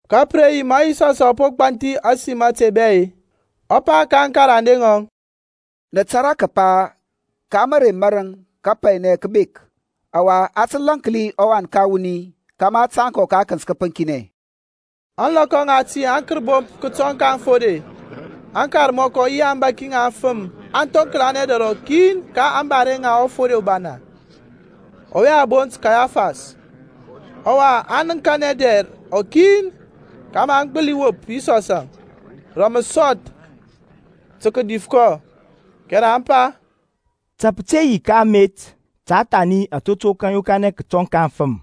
Ka pǝ re yi ma Yisɔsȧŋ ɔ po gbanthi ȧsim ȧte bɛ-e, ɔ pa ka aŋkarande ŋɔŋ, Nǝ tȧrȧ kǝpa ka mǝrei marǝŋ kapainɛ kǝ bek, ɔwa a tǝ lȧnki ɔWan ka wuni kȧmȧ a tȧŋ kɔ ka akǝnt kǝpǝŋkinɛ. Ȧŋlɔkɔ ŋati aŋkərbomp kǝtɔŋ ka aŋfode, aŋkarmɔkɔ yi aŋbȧki ŋa aŋfǝm aŋ thoŋklanɛ dɛr rɔkin ka ȧŋbare ŋa ɔfode ubana, ɔwe a bont Kayafas. Ɔwa aŋ nǝŋkanɛ dɛr rɔkin kȧmȧ aŋ gbǝli wop Yisɔsȧŋ rǝ mǝsɔth tǝ kǝdif kɔ. Kɛrɛ aŋ pa, Ta pǝ te yi ka amet, ta thani atotok aŋ yokanɛ kǝtɔŋ ka aŋfǝm.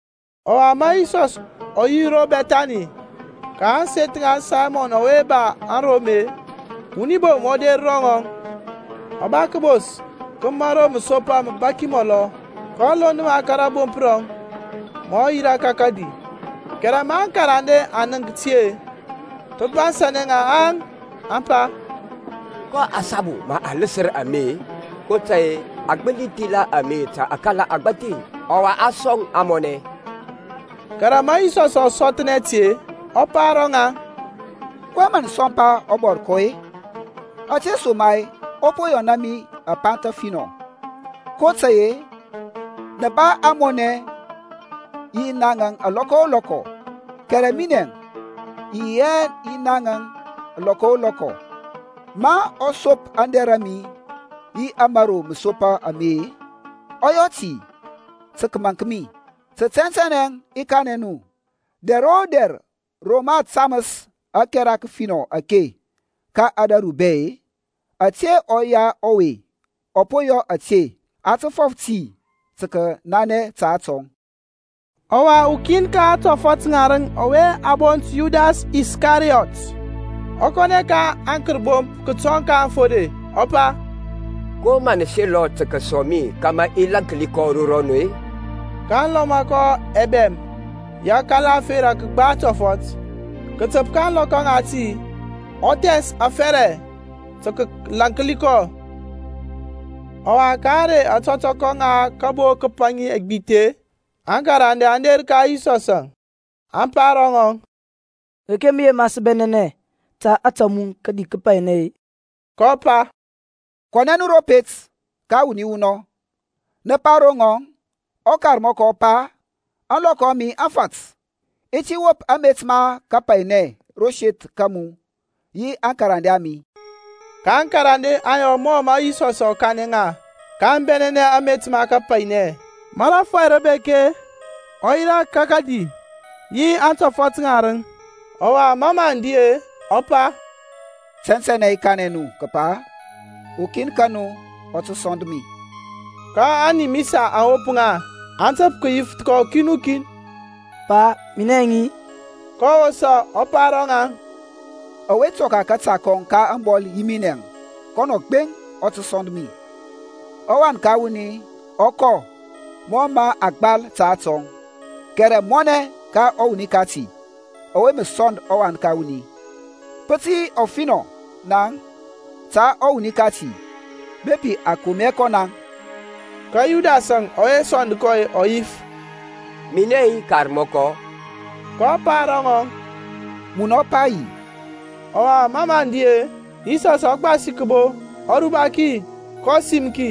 Ɔwa ma Yisɔs ɔ yi ro Bɛthani ka ȧŋseth ŋa Saymɔn ɔwe ba arom-e, wuni bom ɔ der ro ŋɔŋ, ɔ ba kǝbos ka mȧro mǝsopa mǝbaki mɔlɔ, kɔ lond ma ka rȧbomp rɔŋ ma ɔ yirȧ ka kǝdi. Kɛrɛ ma aŋkarande aŋ nənk ti-e, pǝ bansȧnɛ ŋa, aŋ pa, Ko asabu mǝ a lǝsǝr ame-e? kotȧy-e a gbǝli thila ame ta akala agbȧthi, ɔwa a sɔŋ ȧŋmɔnɛ. Kɛrɛ ma Yisɔsȧŋ ɔ sɔthnɛ ti-e, ɔ pa ro ŋaŋ, kɔyɛŋ mǝ nǝ sɔmpa ɔbɔrkɔ-e? Ȧtesoma-e ɔ po yɔna mi apanth afinɔ. kotȧy-e nǝ ba ȧŋmɔnɛ yi naŋȧŋ lɔkɔ o lɔkɔ, kɛrɛ minɛ i yi hɛ yi naŋȧŋ lɔkɔ o lɔkɔ. Ma ɔ sop aŋdɛr a mi yi ȧmȧro mǝsopa ame-e, ɔ yɔ ti tǝ kǝmaŋk mi. Tǝ tɛntɛnɛ i kanɛ nu dɛr o dɛr ro mǝ a tamǝs ȧkɛra kǝfinɔ ake ka ȧdȧru bɛ-e, ȧte ɔya ɔwe ɔ po yɔ a tǝ fɔf ti tǝ kǝnanɛ ta atɔŋ. Ɔwa ukin ka aŋtɔfɔt ŋarǝŋ ɔwe a bont Yudas Iskariyɔt, ɔ kɔnɛ ka aŋkərbomp kǝtɔŋ ka aŋfode, ɔ pa, Ko mǝ nǝ selɔ tǝ kǝsɔŋ mi kȧmȧ i lȧnki kɔ ro nu-e? kaŋ lɔma kɔ ɛbɛm ya akala ȧferȧ kǝgba tɔfɔt. Kǝtǝp ka ȧŋlɔkɔ ŋati ɔ thɛns afɛrɛ tǝ kǝlaŋkli kɔ. Ɔwa ka ȧŋrey ȧtɔtɔkɔ ŋa kǝbo kǝpaŋi ɛgbith-e, aŋkarande aŋ der ka Yisɔsȧŋ, aŋ pa ro ŋɔŋ, Reke mǝ yema sǝ bɛnɛnɛ ta ȧtȧ mu tǝ kǝdi kapainɛ-e? kɔ pa, Kɔnɛ nu ro pet ka wuni wunɔŋ, nǝ pa ro ŋɔŋ, ƆKarmɔkɔ ɔ pa, Ȧŋlɔkɔ a mi aŋ fat. I ti wop amet ma kapainɛ ro seth ka mu yi aŋkarande a mi. Ka aŋkarande aŋ yɔ mɔ mǝ Yisɔs ɔ kanɛ ŋa, ka aŋ bɛnɛnɛ amet ma kapainɛ. Ma rȧfɔy rǝ bek-e, ɔ yirȧ ka kǝdi yi aŋtɔfɔt ŋarǝŋ. Ɔwa ma mǝ aŋ di-e, ɔ pa, Tɛntɛnɛ i kanɛ nu kǝpa ukin ka nu ɔ tǝ sɔnd mi. Ka animisa aŋ wop ŋa, aŋ tǝp kǝyif kɔ ukin o kin, Pa, minɛŋ-i? kɔ wosa ɔ pa ro ŋaŋ, Ɔwe tɔka kȧta kɔŋ ka ȧŋbɔl yi minɛȧŋ, kɔnɔ gbeŋ ɔ tǝ sɔnd mi. ƆWan ka wuni ɔ kɔ mɔ mǝ a gbal ta atɔŋ, kɛrɛ mɔnɛ ka ɔwuni kati ɔwe mǝ sɔnd ɔWan ka wuni. Pǝ tǝ yi ɔfinɔ naŋ ta ɔwuni kati bepi a kom hɛ kɔ naŋ. Ka Yudasȧŋ ɔwe sɔnd kɔ ɔ yif, Minɛ-i Karmɔkɔ? kɔ pa ro ŋɔŋ, Munɔ pa yi. Ɔwa mɔ mǝ aŋ di-e, Yisɔsȧŋ ɔ gbasi kǝbo, ɔ ruba ki kɔ sim ki,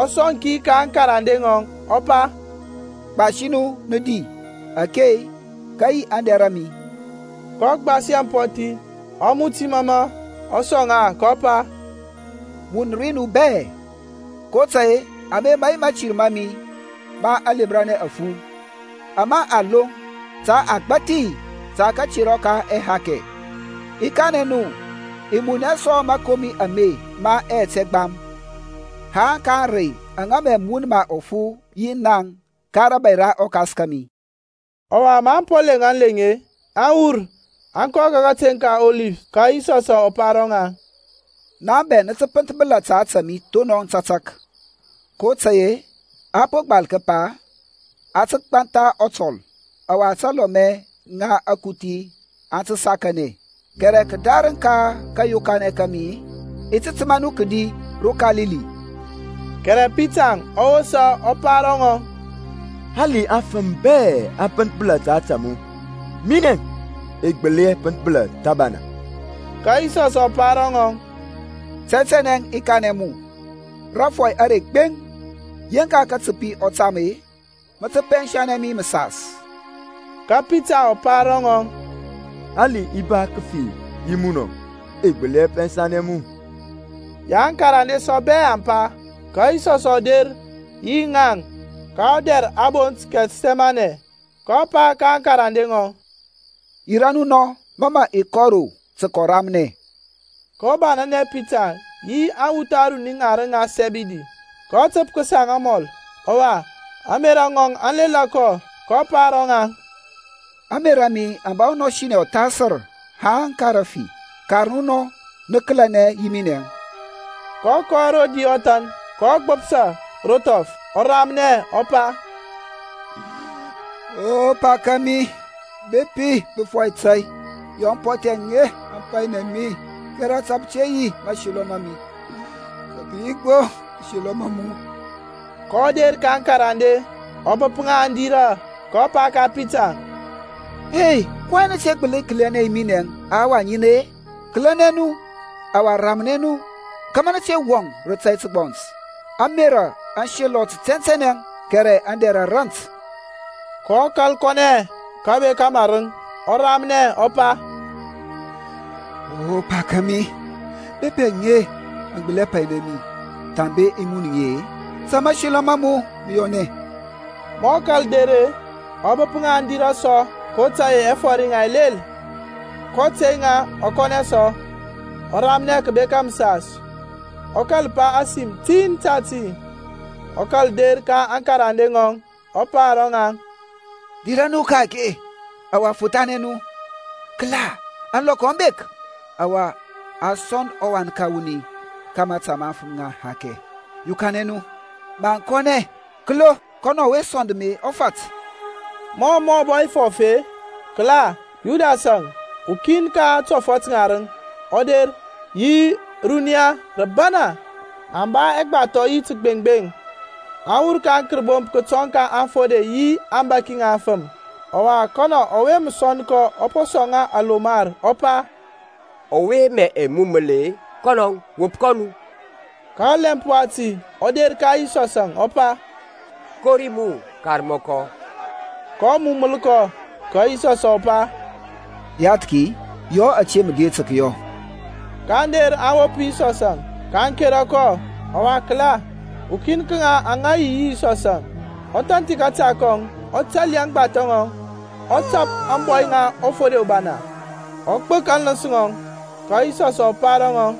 ɔ sɔŋ ki ka aŋkarande, ɔ pa, Gbasi nu, nǝ di. Ake-e, kǝ yi aŋdɛr a mi. kɔ gbasi ampɔthi, ɔ muti mɔmɔ, ɔ sɔŋ ŋa, kɔ pa, Mun ri nu bɛ. kotȧy-e ame mǝ yi mȧtir ma mi ma aŋlemranɛ afu, ama a loŋ ta agbȧthi ta katerɔ ka ɛhakɛ. I kanɛ nu, i mun hɛ sɔ mȧkomi ame ma ɛyɛt ɛgbam, haŋ ka ȧŋrey aŋa mǝ i mun ma ɔfu yi naŋ ka rȧbȧy ra ɔKas kȧmi. Ɔwa maŋ po leŋ aleŋ-e, aŋ wur, aŋ kɔ ka kateŋ ka Ɔlif. Ka Yisɔsȧŋ ɔ pa ro ŋaŋ, Naŋ bɛ nǝ tǝ pǝnthbǝla ta ȧtȧ mi thonɔŋ tȧtȧk. Kotȧy-e a po gbal kǝpa, A tǝ gbantha ɔtɔl, ɔwa talɔmɛ ŋa akuthi aŋ tǝ sakanɛ. Kɛrɛ kǝdarǝŋ ka kȧyokanɛ ka mi-e, i ti tǝma nu kǝdi ro Kalili. Kɛrɛ Pitarȧŋ ɔ wosa ɔ pa ro ŋɔŋ, Hali afǝm bɛ aŋ pǝnthbǝla ta ȧtȧ mu-e, minɛȧŋ i gbǝli hɛ pǝnthbǝla thǝbana. Ka Yisɔsȧŋ ɔ pa ro ŋɔŋ, Tɛntɛnɛ i kanɛ mu, Rȧrɔy are gbeŋ, yeŋk katǝpi ɔ tam-e, mǝ tǝ pɛnsanɛ mi mǝsas. Ka Pitarȧŋ ɔ pa ro ŋɔŋ, Hali i ba kǝfi yi munɔŋ-e, i gbǝli hɛ pɛnsanɛ mu. Yaŋ aŋkarande sɔ bɛ aŋ pa. Ka Yisɔsȧŋ ɔ der yi ŋaŋ ka ɔdɛr a bont Kɛthsɛmanɛ, kɔ pa ka aŋkarande ŋɔŋ, Yirȧ nu nɔ, ma mǝ i kɔ ro tǝ kǝramnɛ. kɔ banȧnɛ Pitarȧŋ yi aŋwuth aruni ŋarǝŋ ŋa Sɛbidi, kɔ tǝp kǝsaŋ amɔl, ɔwa, ȧŋmerȧ ŋɔŋ aŋ lela kɔ. kɔ pa ro ŋaŋ, Ȧŋmerȧ mi aŋ ba ɔnɔsinɛ ɔthasǝr haŋ ka rǝfi. Kar nu nɔ, nǝ kǝlɛnɛ yi minɛȧŋ. kɔ kɔ rodi ɔthan, ka ɔgbǝps a ro thɔf, ɔ ramnɛ, ɔ pa, O Pa kȧmi, bepi pǝ fɔi tȧy yɔ ampɔthi aŋe aŋ painɛ mi; kɛrɛ ta pǝ te yi mȧselɔ ma mi-e, ta pǝ yi gbo mȧselɔ ma mu. kɔ der ka aŋkarande, ɔ bǝp ŋa aŋ dirȧ, kɔ pa ka Pitarȧŋ, kɔyɛŋ nǝ te gbǝli kǝlɛnɛ yi minɛ ahawa ŋin-e? Kǝlɛnɛ nu, ɔwa ramnɛ nu kȧmȧ nǝ te wɔŋ rǝ tȧy tǝgbɔns; ȧŋmerȧ aŋ selɔ tɛntɛnɛ, kɛrɛ aŋdɛr a rant. kɔ kȧl kɔnɛ kǝbeka marǝŋ, ɔ ramnɛ, ɔ pa, O Pa kȧmi, bepi aŋe aŋ gbǝli hɛ painɛ mi thambe i mun ŋi-e, ta mȧselɔ ma mu mǝ yɔnɛ. Ma ɔ kȧl der-e, ɔ bǝp ŋa aŋ dirȧ sɔ kotȧy-e ɛfɔr yaŋ ɛ lel. kɔ tey ŋa, ɔ kɔnɛ sɔ, ɔ ramnɛ kǝbeka mǝsas, ɔ kȧl pa ȧsim tin tati. Ɔ kȧl der ka aŋkarande ŋɔŋ, ɔ pa ro ŋaŋ, Dirȧ nu ka-ake, ɔwa fothanɛ nu. Kǝla, ȧŋlɔkɔ aŋ bek, ɔwa a sɔŋ ɔWan ka wuni ka mȧta ma afǝm ŋa ɛhakɛ. Yokanɛ nu, maŋ kɔnɛ; kǝlo, kɔnɔ ɔwe sɔnd mi ɔ fat. Mɔ mǝ ɔ bɔ fɔf-e, kǝla, Yudasȧŋ, ukin ka aŋtɔfɔt ŋarǝŋ ɔ der, yi runiya rǝbana, aŋ ba ɛgbathɔ yi tǝgbeŋgbeŋ, aŋ wur ka aŋkərbomp kǝtɔŋ ka aŋfode yi aŋbȧki ŋa aŋfǝm. Ɔwa, kɔnɔ ɔwe mǝ sɔnd kɔ ɔ po sɔŋ ŋa alomar, ɔ pa, Ɔwe mǝ i mumǝl-e, kɔnɔȧŋ. Wop kɔ nu. Ka ɔlɛmp wati ɔ der ka Yisɔsȧŋ, ɔ pa, Kori mu Karmɔkɔ! kɔ mumǝl kɔ. Ka Yisɔsȧŋ ɔ pa, Yathki, yɔ ȧte mǝ der tǝ kǝyɔ. Kaŋ der aŋ wop Yisɔsȧŋ, kaŋ kera kɔ. Ɔwa kǝla, ukin ka ŋaŋ aŋa yi yi Yisɔsȧŋ, ɔ thanthi kȧta kɔŋ, ɔ tali aŋgbathɔ ŋɔŋ, ɔ tap ȧŋbɔy ŋa ɔfode ubana, ɔ gbǝk aŋlǝns ŋɔŋ. Ka Yisɔsȧŋ ɔ pa ro ŋɔŋ,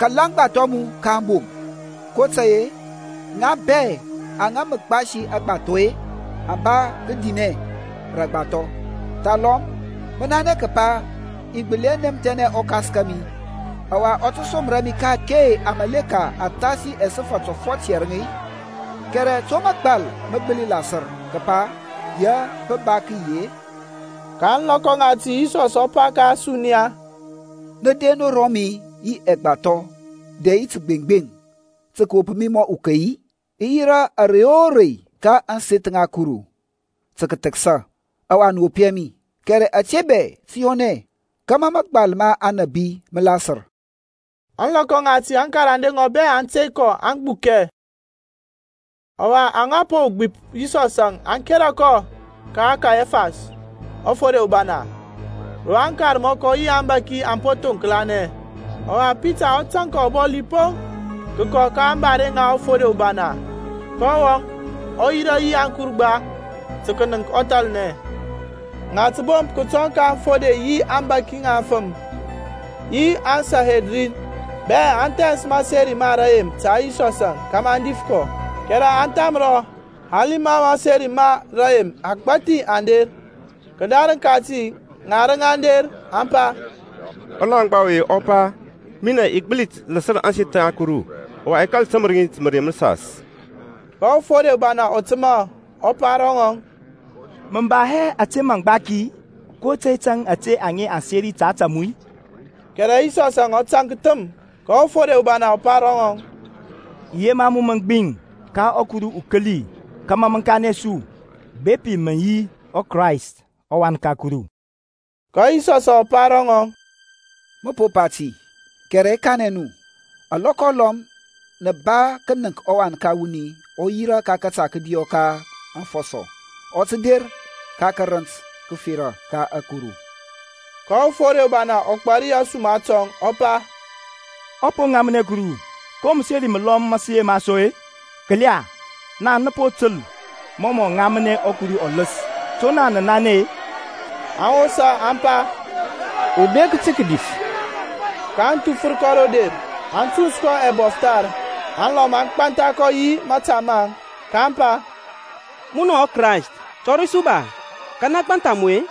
Kala aŋgbathɔ a mu ka aŋbom, kotȧy-e ŋa bɛ aŋa mǝ gbasi aŋgbathɔ-e, aŋ ba kǝdinɛ rǝ aŋgbathɔ. Thalɔm mǝ nanɛ kǝpa i gbǝli hɛ nɛmthɛnɛ ɔKas kȧmi, ɔwa ɔ tǝ som mi ka-ake amȧleka athasi ɛsǝfȧ tɔfɔt yɛrǝŋ-i? Kɛrɛ to mȧgbal mǝ gbǝli lasǝr, kǝpa ya pǝ ba kǝyi-e? Ka ȧŋlɔkɔ ŋati Yisɔs ɔ pa ka ȧsuniya, Nǝ der ro mi yi ɛgbathɔ dɛ yi tǝgbeŋgbeŋ tǝ kǝwop mi mɔ ukey-i? I yirȧ ȧrey o rei ka ȧŋseth ŋa Kuru tǝ kǝthǝksa, ɔwa nǝ wop hɛ mi. Kɛrɛ ȧte bɛ tǝ yɔnɛ kȧmȧ mȧgbal ma aŋnabi mǝ lasǝr. Ȧŋlɔkɔ ŋati aŋkarande ŋɔŋ bɛ aŋ tey kɔ aŋ gbukɛ. Ɔwa, aŋa po gbip Yisɔsȧŋ aŋ kera kɔ ka Kayafas ɔfode ubana, ro aŋkarmɔkɔ yi aŋbȧki aŋ po thoŋklanɛ. Ɔwa Pitarȧŋ ɔ tȧŋ kɔ ɔbɔli poŋ, kǝkɔ ka ȧŋbare ŋa ɔfode ubana, kɔ wɔŋ, ɔ yirȧ yi aŋkurgba tǝ kǝnǝŋk ɔthalnɛ. Ŋatǝbomp kǝtɔŋ ka aŋfode yi aŋbȧki ŋa aŋfǝm, yi aŋSanhedrin bɛ aŋ thɛns mǝseri ma rǝyem ta Yisɔsȧŋ, kȧmȧ aŋ dif kɔ, kɛrɛ aŋ thamrɔ, hali ma mǝseri ma rǝyem agbȧthi aŋ der. Kǝdarǝŋ kati ŋarǝŋ aŋ der, aŋ pa, Ɔlaŋgba ɔwe ɔ pa, Minɛ i gbǝli lǝsǝr ȧŋseth ŋa Kuru, ɔwa, i kȧl tǝmǝr ŋi rǝ mǝrei mǝsas. Ka ɔfode ubana ɔ tǝma, ɔ pa ro ŋɔŋ, Mǝ ba hɛ ȧte maŋ gbaki-i? Ko tȧy tȧŋ ȧte aŋe aŋ seri ta ȧtȧ mu-e? Kɛrɛ Yisɔsȧŋ ɔ tȧnk thǝm. Ka ɔfode ubana ɔ pa ro ŋɔŋ, I yema mu mǝ gbiŋ ka ɔKuru ukǝli kȧmȧ mǝ kanɛ su bepi mǝ yi ɔKrayst ɔWan ka Kuru. Ka Yisɔsȧŋ ɔ pa ro ŋɔŋ, Mǝ po pa ti, kɛrɛ i kanɛ nu, alɔkɔ alɔm nǝ ba kǝnǝnk ɔWan ka wuni ɔ yirȧ ka kȧta kȧdiyɔ ka afɔsɔ, ɔ tǝ der ka tǝrǝnt tǝfera ka ȧkuru. Ka ɔfode ubana ɔ gbari ȧsuma tɔŋ, ɔ pa, Ɔ po ŋamnɛ Kuru! Ko mǝseri mǝlɔm mǝ sǝ yema sɔ-e? Kǝla, naŋ nǝ po tǝl mɔ ɔ ŋamnɛ Kuruȧŋ ɔlǝs. To naŋ nǝ nanɛ-e? Aŋ wosa aŋ pa, Ubek tǝ kǝdif! kaŋ thufǝr kɔ ro der, aŋ tuns kɔ ɛbɔfthar, alɔm aŋ gbantha kɔ yi mȧta maŋ, kaŋ pa, Munɔ ɔKrayst, tɔri su ba; Kanɛ gbantha mu-e?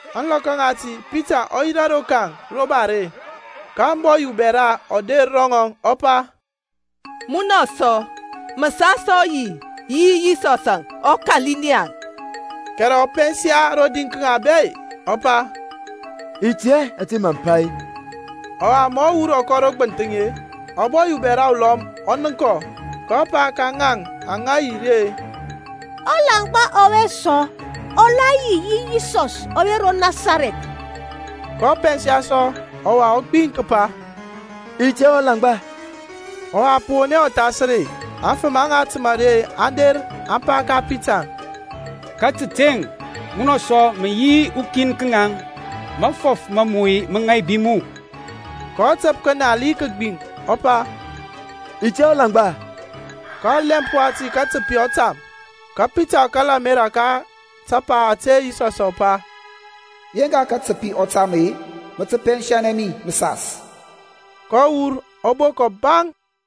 Ȧŋlɔkɔ ŋati Pitarȧŋ ɔ yirȧ rokaŋ ro bare, ka ȧŋbɔy ubɛra ɔ der ro ŋɔŋ, ɔ pa, Munɔ sɔ mǝ sa yi yi Yisɔs ɔKalilian. Kɛrɛ ɔ pɛnsa rodi ka ŋaŋ bɛ-e, ɔ pa, i tɛ hɛ ȧtȧ mǝ pa. Ɔwa ma ɔ wur ɔ kɔ ro gbǝnthǝŋ-e, ȧbɔy ubɛra ulɔm ɔ nənk kɔ, kɔ pa ka ŋaŋ aŋa yi ri-e, Ɔlaŋgba ɔwe sɔ ɔ la yi yi Yisɔs ɔwe ro Nasarɛth. kɔ pɛnsa sɔ ɔwa ɔ gbiŋ kǝpa, I tɛ hɛ ɔlaŋgba. Ɔwa pǝ won hɛ ɔthasǝr-e, aŋfǝm aŋa tǝma ri aŋ der aŋ pa ka Pita, Ka tǝteŋ, munɔ sɔ mǝ yi ukin ka ŋaŋ, mafɔf ma mu mǝ ŋaibi mu. kɔ tǝp kǝnal yi kǝgbiŋ, ɔ pa, I tɛ hɛ ɔlaŋgba. Ka ɔlɛmp wati katǝpi ɔ tam. Ka Pitarȧŋ ɔ kala ȧmerȧ ka tapa ȧte Yisɔsȧŋ ɔ pa, Yeŋka katǝpi ɔ tam-e, mǝ tǝ pɛnsanɛ mi mǝsas. Kɔ wur, ɔ bok ɔbaŋ.